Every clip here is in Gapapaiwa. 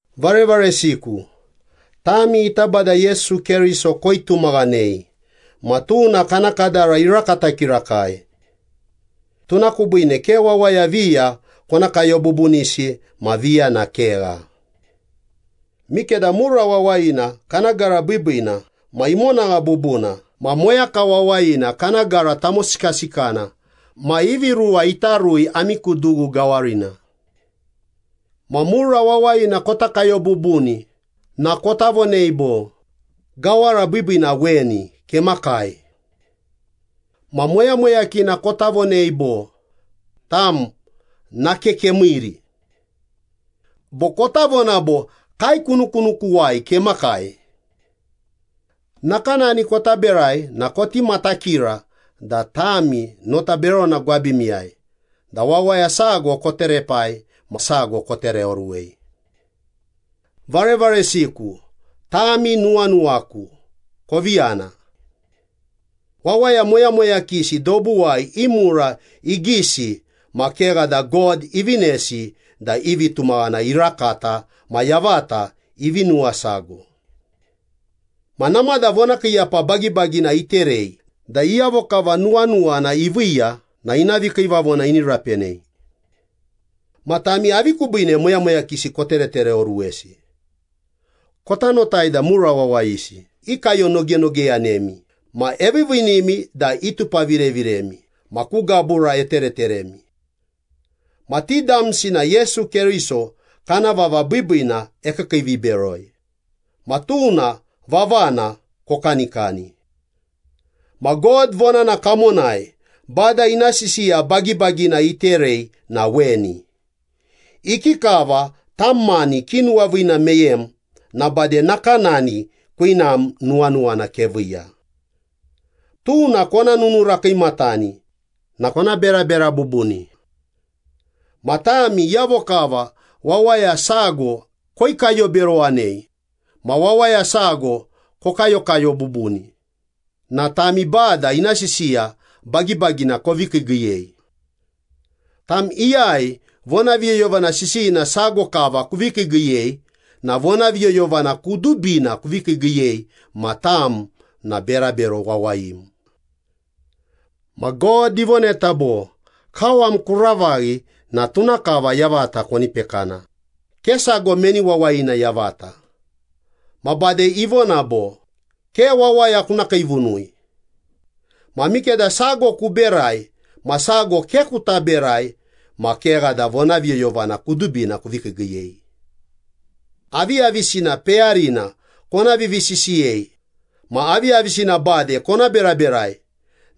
Varevaresiku, tami ita Bada Yesu Keriso koitumaghanei ma tuna kana kadara irakata kirakai. Tuna kubiine ke wawaya viya kona kayo bubunisi ma viya na kegha. Mikeda mura wawayina kana gara biibiina ma imonagha bubuna ma moyaka wawayina kana gara tamosikasikana ma ivi ruwa ita rui ami ku dughu gawarina. Ma mura wawayina kota kayo bubuni na kota vonei bo, “Gawara biibiina weni, kemakai.” Ma moyamoyakina kota vonei bo, “Tam, nake kemiiri.” Bo kota vona bo, “Kaekunukunukuwai kemakai.” Nakanani kota berai na koti matakira da tami nota berona gwabimiyai da wawaya sago koterepai ma sago kotereoruwei. Varevaresiku, tami nuwanuwaku, kovi yana. Wawaya moyamoyakisi dobuwai i mura igisi ma kegha da God ivinesi da i vitumaghana irakata ma yavata ivi nuwasago. Ma namada vonakiiyapa bagibagina iterei da iyavo kava nuwanuwana iviiya na ina vikiivavona ini rapenei. Ma tami, avi kubiine moyamoyakisi koteretereoruwesi? Kota notai da mura wawayisi ikayonogenogeyanemi ma eviiviinimi da itupavireviremi ma ku gabura etereteremi. Ma ti damsi na Yesu Keriso kana vava biibiina ekiikiiviberoi, ma tuna vavana kokanikani. Ma God vonana kamonai Bada ina sisiya bagibagina iterei na weni, “Ikikava tam mani kinuwaviina meyem na bade nakanani kwinam nuwanuwana keviiya.” Tuna kona nununura kiimatani na kona berabera bubuni. Ma tami iyavo kava wawaya sago koikayoberowanei ma wawaya sago kokayokayo bubuni na tami Bada ina sisiya bagibagina kovi kiigiiyei. Tam iyai vonaviyoyovana sisiyina sago kava kuvi kiigiiyei na vonaviyoyovana kudubina kuvi kiigiiyei ma tam na berabero wawayim. Ma God ivoneta bo, “Kawam kuravaghi na tuna kava yavata koni pekana, ke sago meni wawayina yavata.” Ma bade ivona bo, “Ke wawaya kuna kiivunui.” Ma mikeda sago kuberai ma sago ke kuta berai ma kegha da vonaviyoyovana kudubina kuvi kiigiiyei. Aviyavisina peyarina kona vivisisiyei ma aviyavisina bade kona beraberai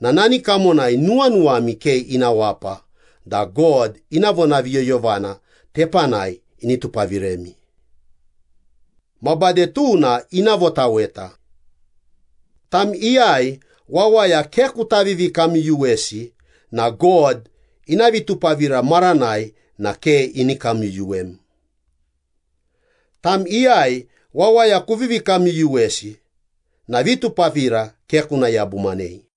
na nani kamonai nuwanuwami ke ina wapa da God ina vonaviyoyovana tepanai ini tupaviremi. Ma bade tuna ina votaweta. Tam iyai wawaya ke kuta vivikamyuyuwesi na God ina vitupavira maranai na ke ini kamyuyuwem. Tam iyai wawaya kuvivi kamyuyuwesi na vitupavira ke kuna yabumanei.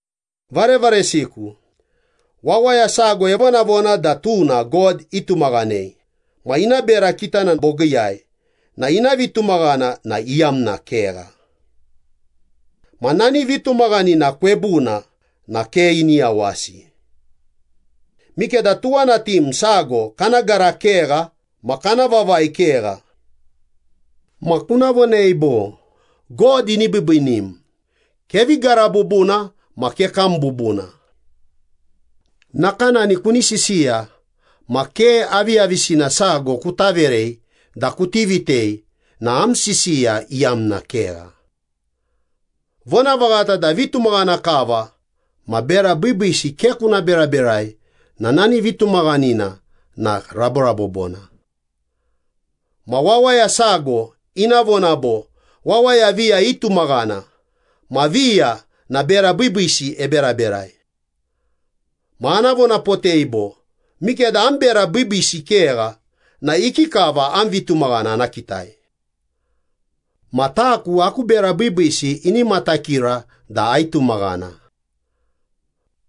Varevaresiku, wawaya sago evonavona da tuna God itumaghanei ma ina bera kitana bogiiyai na ina vitumaghana na iyamna kegha. Ma nani vitumaghanina kwebuna na ke ini yawasi. Mikeda tuwanatim sago kana gara kegha ma kana vavai kegha. Ma kuna vonei bo, “God ini biibiinim, kevi gara bubuna ma kekam bubuna.” Nakanani kuni sisiya ma ke aviyavisina sago kuta verei da kuti vitei na am sisiya iyamna kegha. Vonavaghata da vitumaghana kava ma bera biibiisi ke kuna beraberai na nani vitumaghanina na raborabobona. Ma wawaya sago ina vona bo, “Wawaya viya itumaghana, ma viya na bera biibiisi eberaberai.” Ma ana vonapotei bo, “Mikeda am bera biibiisi kegha na ikikava am vitumaghana ana kitai? Ma taku, aku bera biibiisi ini matakira da aitumaghana.”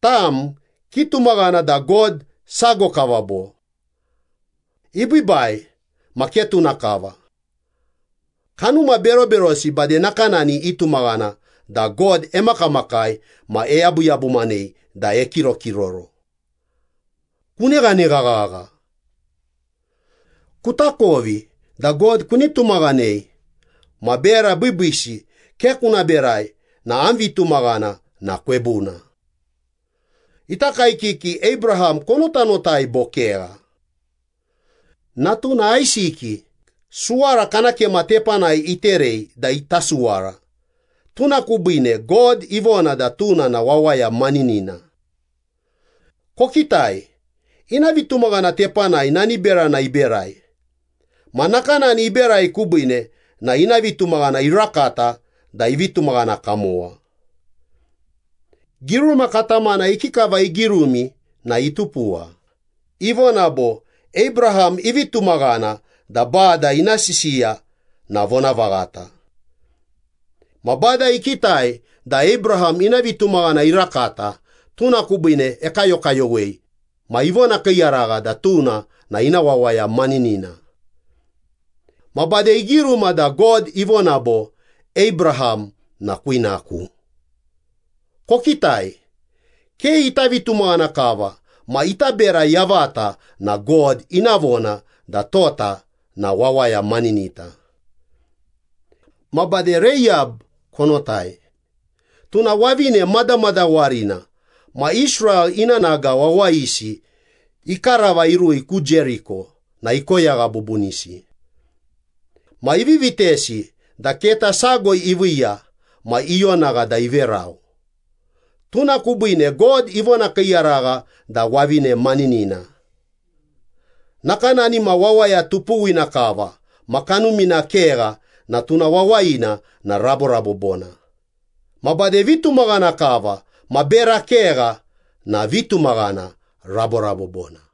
Tam, kitumaghana da God sago kava bo? Ibiibai! Ma ke tuna kava. Kanuma beroberosi bade nakanani itumaghana da God emakamakai ma eyabuyabumanei da ekirokiroro. Kuneghanegha ghagha! Kutakovi da God kuni tumaghanei ma bera biibiisi ke kuna berai na am vitumaghana na kwebuna. Ita kaekiki Abraham konotanotai bo kegha? Natuna Aisiki suwara kana kema tepanai iterei da ita suwara, tuna kubiine God ivona da tuna na wawaya maninina. Kokitai, ina vitumaghana tepanai nani berana iberai, ma nakanani iberai kubiine na ina vitumaghana irakata da ivi tumaghana kamowa. Giruma katamana ikikava igirumi na itupuwa. Ivona bo, “Abraham ivi tumaghana da Bada ina sisiya na vonavaghata. Ma Bada ikitai da Abraham ina vitumaghana irakata, tuna kubiine ekayokayowei ma ivonakiiyaragha da tuna na ina wawaya maninina.” Ma bade igiruma da God ivona bo, “Abraham na kwinaku.” Kokitai, ke ita vitumaghana kava ma ita bera yavata na God ina vona da tota na wawaya maninita. Ma bade Reiyab konotai. Tuna wavine madamadawarina ma Israel i nanaga wawayisi ikarava irui ku Jeriko na ikoyagha bubunisi. Ma ivi vitesi da keta sago iviiya ma ionagha da iverau. Tuna kubiine God ivonakiiyaragha da wavine maninina. Nakanani ma wawaya tupuwina kava ma kanumina kegha na tuna wawayina na raborabobona, ma bade vitumaghana kava ma bera kegha na vitumaghana raborabobona.